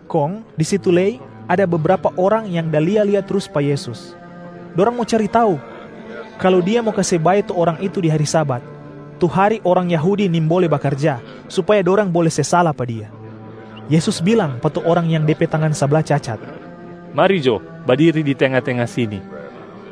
Kong di situ lei ada bebrapa orang yang da lia-lia trus pa Yesus. Dorang mo cari tau kalu Dia mo kase bae tu orang itu di hari Sabat, tu hari orang Yahudi nimbole bakarja, supaya dorang bole se sala pa Dia. Yesus bilang pa tu orang yang de pe tangan sabla cacat, “Mari jo badiri di tenga-tenga sini.”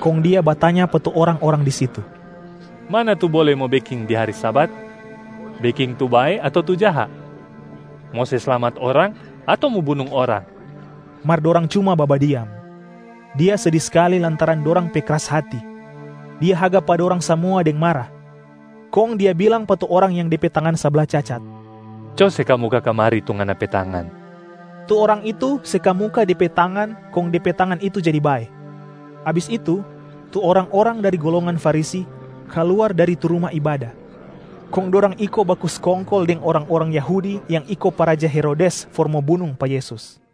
Kong Dia batanya pa tu orang-orang di situ, “Mana tu bole mo beking di hari Sabat? Beking tu bae ato tu jaha? Mo se slamat orang ato mo bunung orang?” Mar dorang cuma babadiam. Dia sedi skali lantaran dorang pe kras hati. Dia haga pa dorang samua deng mara, kong Dia bilang pa tu orang yang de pe tangan sabla cacat, “Co se kamuka kamari tu ngana pe tangan!” Tu orang itu se kamuka de pe tangan kong de pe tangan itu jadi bae. Abis itu tu orang-orang dari golongan Farisi kaluar dari tu ruma ibada, kong dorang iko baku skongkol deng orang-orang Yahudi yang iko pa raja Herodes for mo bunung pa Yesus.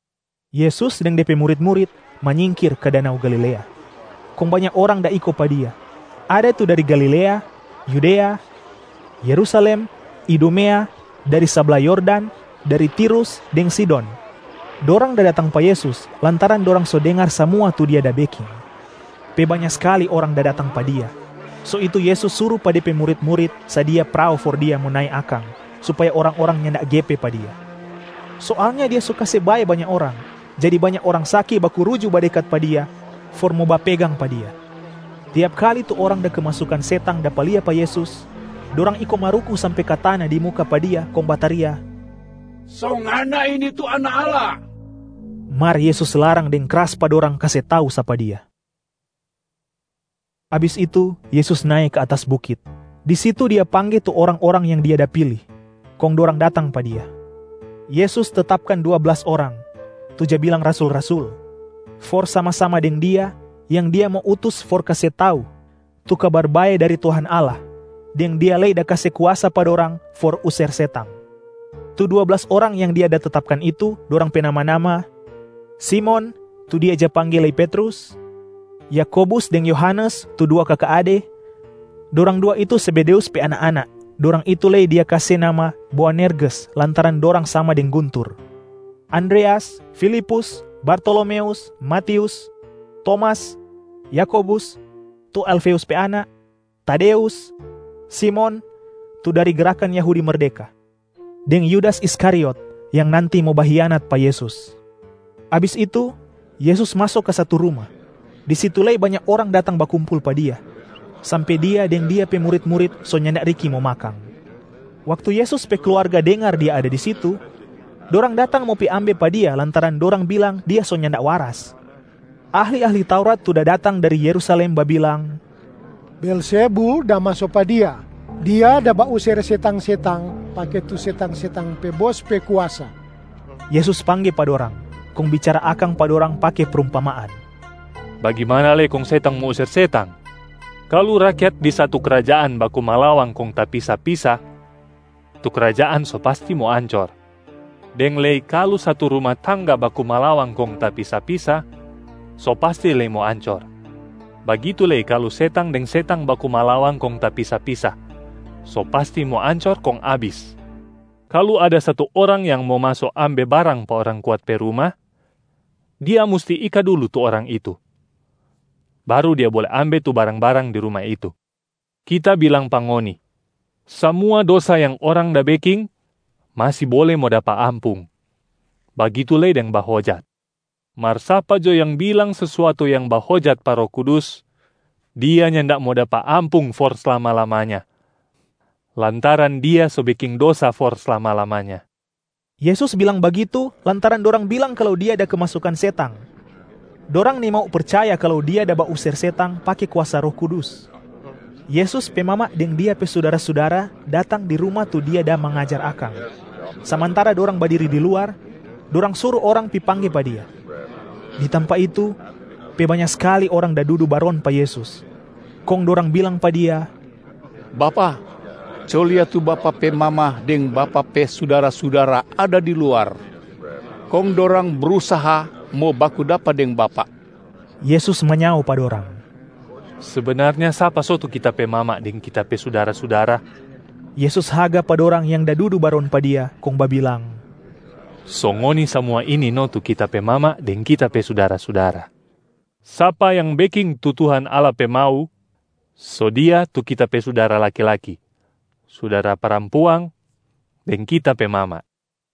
Yesus deng De pe murit-murit manyingkir ka danau Galilea, kong banya orang da iko pa Dia. Ada tu dari Galilea, Yudea, Yerusalem, Idumea, dari sabla Yordan, dari Tirus deng Sidon. Dorang da datang pa Yesus lantaran dorang so dengar samua tu Dia da beking. Pe banya skali orang da datang pa Dia, so itu Yesus suru pa De pe murit-murit sadia prao for Dia mo nae akang, supaya orang-orang nyanda gepe pa Dia. Soalnya Dia so kase bae banya orang, jadi banya orang saki baku ruju badekat pa Dia for mo bapegang pa Dia. Tiap kali tu orang da kemasukan setang dapa lia pa Yesus, dorang iko maruku sampe ka tana di muka pa Dia kong bataria, “So Ngana ini tu Anak Allah!” Mar Yesus larang deng kras pa dorang kase tau sapa Dia. Abis itu Yesus nae ka atas bukit. Di situ Dia pangge tu orang-orang yang Dia da pili, kong dorang datang pa Dia. Yesus tetapkan dua blas orang, tu ja bilang rasul-rasul, for sama-sama deng Dia, yang Dia mo utus for kase tau tu Kabar Bae dari Tuhan Allah, deng Dia lei da kase kuasa pa dorang for user setang. Tu dua blas orang yang Dia da tetapkan itu, dorang pe nama-nama: Simon (tu Dia ja pangge lei Petrus), Yakobus deng Yohanes tu dua kaka ade (dorang dua itu Zebedeus pe anak-anak, dorang itu lei Dia kase nama Boanerges lantaran dorang sama deng guntur), Andreas, Filipus, Bartolomeus, Matius, Tomas, Yakobus (tu Alfeus pe anak), Tadeus, Simon (tu dari Gerakan Yahudi Merdeka), deng Yudas Iskariot (yang nanti mo bahianat pa Yesus). Abis itu, Yesus maso ka satu ruma. Di situ lei banya orang datang bakumpul pa Dia, sampe Dia deng Dia pe murit-murit so nyanda riki mo makang. Waktu Yesus pe kluarga dengar Dia ada di situ, dorang datang mo ambe pa Dia lantaran dorang bilang Dia so nyanda waras. Ahli-ahli Taurat tu da datang dari Yerusalem babilang, “Beelzebul da maso pa Dia! Dia da bauser setang-setang pake tu setang-setang pe bos pe kuasa.” Yesus pangge pa dorang, kong bicara akang pa dorang pake prumpamaan, “Bagimana lei kong setang mo user setang? Kalu rakyat di satu krajaan baku malawang kong tapisa-pisa, tu krajaan so pasti mo ancor, deng lei kalu satu ruma tangga baku malawang kong tapisa-pisa, so pasti lei mo ancor. Bagitu lei kalu setang deng setang baku malawang kong tapisa-pisa, so pasti mo ancor kong abis. Kalu ada satu orang yang mo maso ambe barang pa orang kuat pe ruma, dia musti ika dulu tu orang itu, baru dia bole ambe tu barang-barang di ruma itu.a Kita bilang pa ngoni, samua dosa yang orang da beking masi bole mo dapa ampung, bagitu lei deng bahojat. Mar sapa jo yang bilang sesuatu yang bahojat pa Roh Kudus, dia nyanda mo dapa ampung for slama-lamanya, lantaran dia so beking dosa for slama-lamanya.” Yesus bilang bagitu lantaran dorang bilang kalu Dia da kemasukan setang, dorang nimau percaya kalu Dia da bauser setang pake kuasa Roh Kudus. Yesus pe mama deng Dia pe sudara-sudara datang di ruma tu Dia da mangajar akang. Samantara dorang badiri di luar, dorang suru orang pi pangge pa Dia. Di tampa itu, pe banya skali orang da dudu baron pa Yesus, kong dorang bilang pa Dia, “Bapak, co lia tu Bapak pe mama deng Bapak pe sudara-sudara ada di luar, kong dorang brusaha mo baku dapa deng Bapak.” Yesus manyao pa dorang, “Sebenarnya sapa so tu Kita pe mama deng Kita pe sudara-sudara?” Yesus haga pa dorang yang da dudu baron pa Dia, kong babilang, “So ngoni samua ini no tu Kita pe mama deng Kita pe sudara-sudara. Sapa yang beking tu Tuhan Allah pe mau, so dia tu Kita pe sudara laki-laki, sudara parampuang, deng Kita pe mama.”